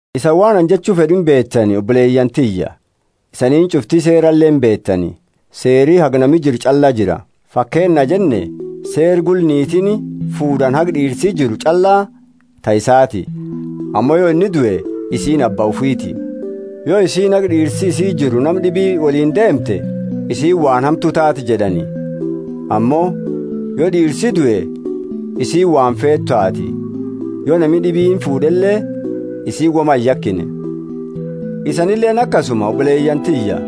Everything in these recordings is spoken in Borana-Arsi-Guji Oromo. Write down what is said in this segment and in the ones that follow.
Isani waan anini jechu fed'u inuma beetani, oboleyaani tiyya, isaniini ch'ufti seerale imbeetani: Seeri haga nami jiru ch'alla jira. Fakeennaa jenne, Seera gula, niitiini fuud'ani haga d'iirsi jiru ch'alla ta isaati; ammo yo inni due, isiini abba ufiiti. Yo isiini haga d'iirsi isii jiru nama d'ibi woliini deemte, isiini waan hamtu taate jed'ani; ammo yo d'iirsi due, isiini waan feetu taati, yo nami d'ibiini fuud'ele isiini woma iyakine. Isanileeni akasuma, oboleyaani tiyya.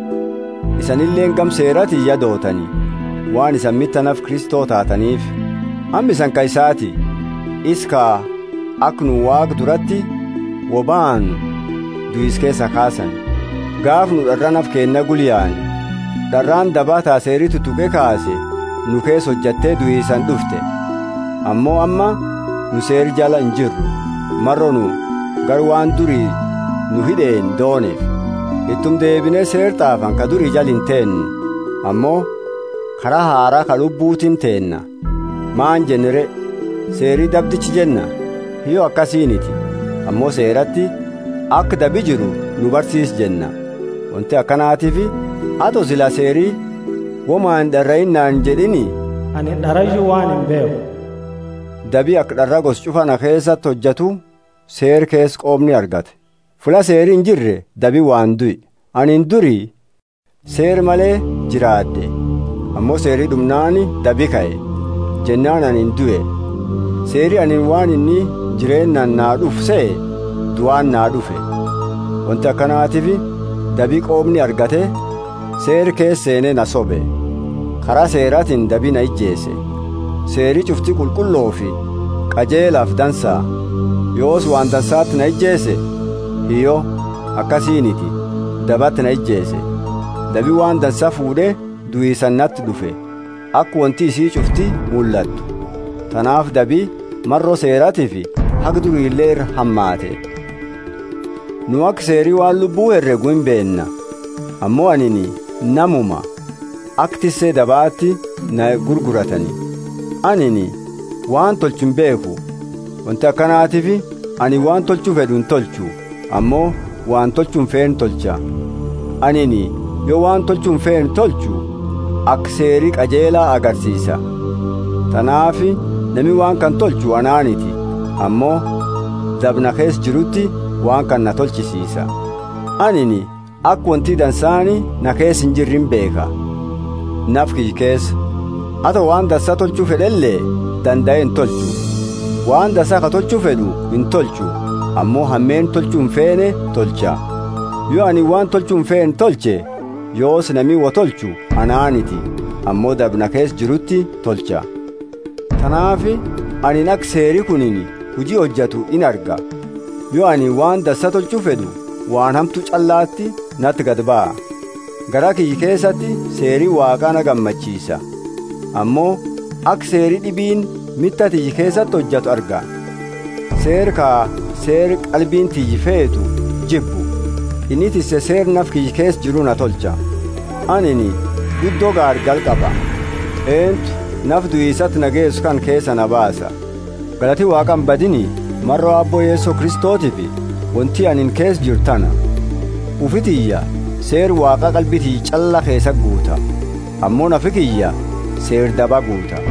Isanileeni gama Seeratiini ya dootani, waan isani mita nafa Kristo taataniifi; amma isani ka isaati, isa ka aka nu Waaqa durati wo baanu duisa keesaa kaasani. Gaafa nu d'araa nafa keenna gula yaane, d'araani dabaa ta Seeri tutuqe kaase nu keesa hojate duisaani d'ufte. Ammo amma nu Seera jala injirru, maro nu gara waan duri nu hid'eeni dooneefi. Ituma deebine seera t'aafani ka duri jala inteennu, ammo kara haraa ka Lubbutiini teenna. Maani jenna re? Seeri dabdicha jenna? Hiyyo, akasiiniti. Ammo Seerati aka dabi jiru na barsiise jenna. Wonti akanatiifi ato sila seeri, Woma ind'araiini naani injed'iini, anini d'arayu waan imbeekhu. Dabi aka d'araa gosa ch'ufa na keesati hojatu seera keesa qoomni argate. Fulla seeri injirre dabi waan due. Anini duri seera male jiraad'e; ammo seeri d'umnaani dabi kae, jennaani anini due. Seeri anini waan inni jireennaani naa d'ufu sehe, duaani naa d'ufe. Wonti akanatiifi dabi qoomni argate, seera keesa seene na sobe; kara seeratiini dabi na ijeese. Seeri ch'ufti qulqullofi qajeelafi dansa. Yoosi waan dansati na ijeese? Hiyyo, akasiiniti. Dabati na ijeese; dabi waan dansa fuud'e duisaani nati d'ufe, aka wonti isii ch'ufti mullattu. Tanaafi dabi maro seeratiifi haga durile ira hamaate. Nu aka Seeri waan lubbu heregu imbeenna; ammo anini namuma, aka tisse dabati na gurguratani. Anini waan tolchu imbeekhu; wonti akanatiifi anini waan tolchu fed'u intolchu, ammo waan tolchu imfeene tolcha. Anini yo waan tolchu imfeene tolchu aka seeri qajeela agarsiisa. Tanaafi nama waan kana tolchu anaaniti, ammo daba na keesa jiruti waan kana na tolchisiisa. Anini aka wonti dansaani na keesa injirre imbeekha, nafa kiyya keesa. Ato waan dansa tolchu fed'ele dandae intolchu. Waan dansa ka tolchu fed'u intolchu, ammo hameenna tolchu imfeene tolcha. Yo anini waan tolchu imfeene tolche, yoosi nami woi tolchu anaaniti; ammo daba na keesa jiruti tolcha. Tanaafi anini aka seeri kuni huji hojatu inarga: yo anini waan dansa tolchu fed'u waan hamtu ch'allati nati gadi baha. Garaa kiyya keesati Seeri Waaqa na gammachiisa. Ammo aka seeri d'ibiini mita tiyya keesa hojatu arga, seera ka seera qalbiini tiyya feetu jibbu. Inni tisse seera nafa kiyya keesa jiru na tolcha. Anini guddo gaargala qaba! Eentu nafa duisati na geesu kana keesaa na baasa? Galati Waaqa imbadiini, maro Aabbo Yeso Kristotiifi! Wonti anini keesa jiru tana: ufi tiyya seera Waaqa qalbi tiyya ch'alla keesati guuta, ammo nafi kiyya seera daba guuta.